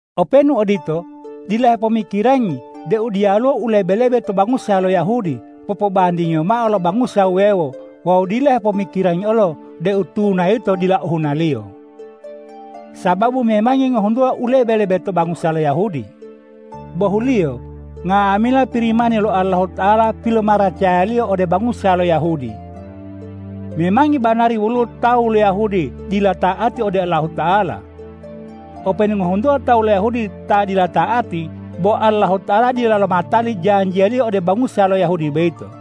Openu odito, dila hepomikirangi deu diyaluwo u lebe-lebe to bangusa lo Yahudi popobandingiyo mao lo bangusa wuwewo wawu dila hepomikirangi olo deu tuna yito dila ohunaliyo, sababu memangi ngohuntuwa u lebe-lebe to bangusa lo Yahudi. Bohuliyo, nga'amila Pirimani lo Allahuta'ala pilomaracaya-Liyo ode bangusa lo Yahudi. Memangi banari woluwo tawu lo Yahudi ta dila ta'ati ode Allahuta'ala. Openu ngohuntuwa tawu lo Yahudi ta dila ta'ati, bo Allahuta'ala dila lomatali janjiya-Liyo ode bangusa lo Yahudi boyito.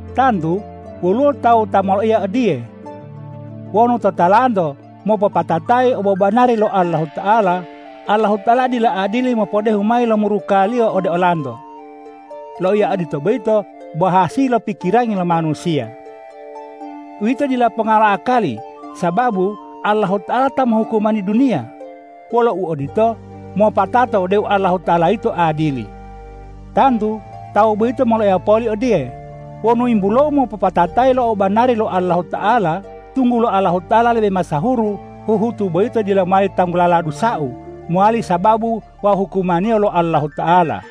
Tantu woluwo tawu ta moloiya odiye,”Wonu totalanto mopopatatayi obobanari lo Allahuta'ala, Allahuta'ala dila adili mopodehu mayi lo muruka-Liyo ode olanto.” Loiya odito boyito bo hasili lo pikirangi lo manusiya. Uwito dila ponga lo akali! Sababu Allahuta'ala ta mohukumani duniya. Wolo uodito, mopatato deu Allahuta'ala yito adili. Tantu tawu boyito moloiya poli odiye,”Wonu yimbulou mopopatatayi lo obobanari lo Allahuta'ala, tunggulo Allahuta'ala lebe masahuru, huhutu'u boyito dila mowali tanggulala dusa u mowali sababu wau hukumaniyo lo Allahuta'ala.”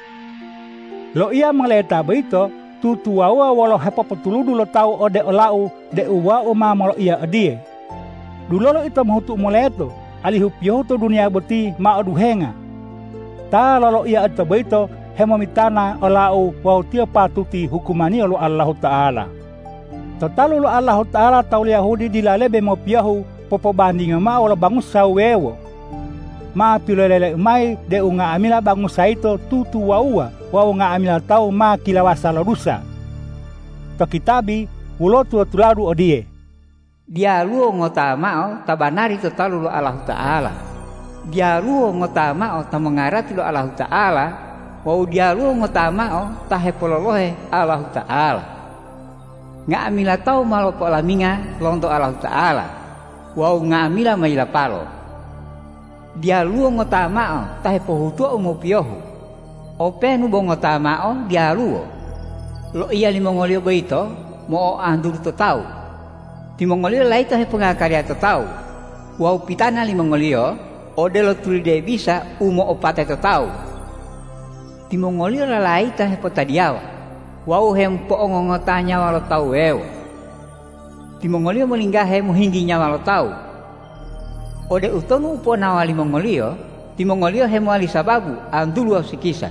Loiya moleta boyito tutuwawuwa wolo u hepopotuludu lo tawu ode olau deu wau ma loloiya odiye,”Dulolo ito mohutu u moleto, alihu piyohu to duniya boti ma oduhenga!” Ta loloiya odito boyito hemomitana olau wawu tiyo patuti hukumaniyo lo Allahuta'ala. To talu lo Allahuta'ala tawu lo Yahudi dila lebe mopiyohu popobandingiyo mao wolo bangusa wuwewo. Ma piloleleu mayi deu nga'amila bangusa yito tutuwawuwa wawu nga'amila tawu ma kilawasa lo dusa. To kitabi woluwo tula-tuladu odiye,”Diyaluwo ngota mao ta banari to talu lo Allahuta'ala, diyaluwo ngota mao ta mongarati lo Allahuta'ala wawu diyaluwo ngota mao ta hepololohe Allahuta'ala. Nga'amila tawu ma lopo'olaminga lonto Allahuta'ala wawu nga'amila ma yilapalo. Diyaluwo ngota mao ta hepohutuwa u mopiyohu, openu bo ngota mao diyaluwo! Loiya limongoliyo boyito mo'oantulu to tawu, timongoliyo layito hepongakaliya to tawu wawu pitana limongoliyo odelo tulide bisa u mo'opate to tawu. Timongoliyo lalayita hepotadiyawa wawu hemopo'ongongota nyawa lo tawu wuwewo. Timongoliyo molinggahe mohinggi nyawa lo tawu. Ode utonu ponaowa limongoliyo, timongoliyo hemowali sababu antulu wawu sikisa.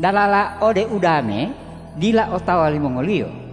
Dalala ode udame dila otawa limongoliyo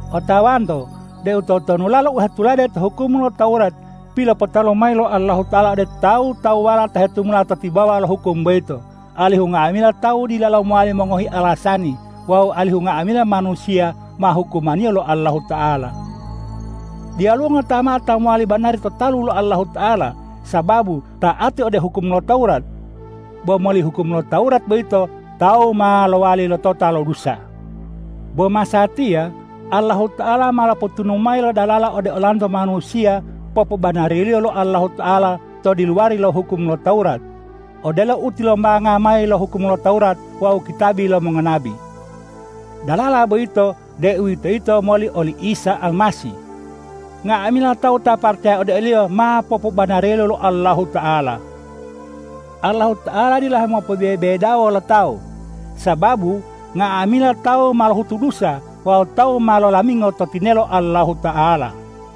Otawanto deu totonulalo u hetulade to hukum lo Tawurat pilopotalu mayi lo Allahuta'ala ode tawu-tawuwala ta hetumula to tibawa lo hukum boyito, alihu nga'amila tawu dilalo mowali mongohi alasani wawu alihu nga'amila manusiya ma hukumaniyo lo Allahuta'ala. Diyaluwo ngota mao ta mowali banari to talu lo Allahuta'ala sababu ta'ati ode hukum lo Tawurat. Bo moli hukum lo Tawurat boyito tawu ma lowali lotota lo dusa. Bo masatiya Allahuta'ala ma lopotunu mayi lo dalala ode olanto manusiya popobanariyo lo Allahuta'ala to diluwari lo hukum lo Tawurat, odelo u tilombanga mayi lo hukum lo Tawurat wawu kitabi lo mongonabi. Dalala boyito, deuwitoyito moli oli Isa Almasih. Nga'amila tawu ta paracaya ode o-Liyo ma popobanariyo lo Allahuta'ala. Allahuta'ala dila hemopobebedawo lo tawu, sababu nga'amila tawu ma lohutu dusa wawu tawu ma lolamingo to tinelo Allahuta'ala.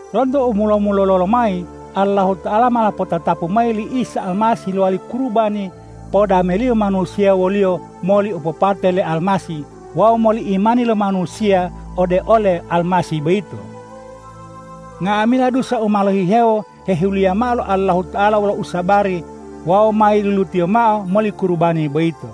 Lonto u mulo-mulolo lomayi Allahuta'ala ma lopotatapu mayi li Isa Almasih lowali kurubani podameliyo manusiya wo-Liyo moli opopate le Almasih wawu moli imani lo manusiya ode ole Almasih boyito. Nga'amila dusa u ma lohihewo hehiluliya mao lo Allahuta'ala wolo usabari wawu ma yilulu-Tiyo mao moli kurubani boyito.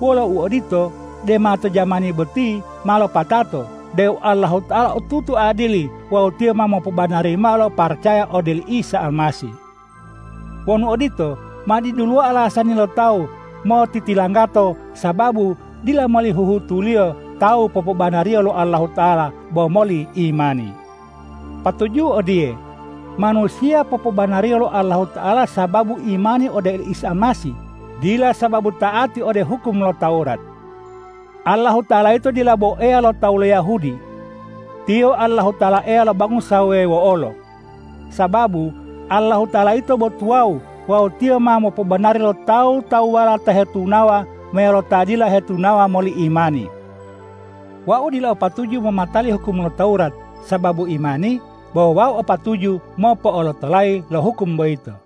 Wolo uodito, dema to jamani boti ma lopatato deu Allahuta'ala otutu adili wawu Tiyo ma mopobanari mao lo ta paracaya ode oli Isa Almasih. Wonu odito, ma diduluwo alasani lo tawu motitilanggato, sababu dila moli huhutuliyo tawu popobanariyo lo Allahuta'ala bo moli imani. Patuju'u odiye, manusiya popobanariyo lo Allahuta'ala sababu imani ode oli Isa Almasih, dila sababu ta'ati ode hukum lo Tawurat. Allahuta'ala yito dila bo Eya lo tawu lo Yahudi. Tiyo Allahuta'ala Eya lo bangusa wuwewo olo. Sababu Allahuta'ala yito bo tuwawu wawu Tiyo ma mopobanari lo tawu-tawuwala ta hetunawa meyalo ta dila hetunawa moli imani. Wau dila o patuju momatali hukum lo Tawurat, sababu imani bo wau o patuju mopo'olotolayi lo hukum boyito.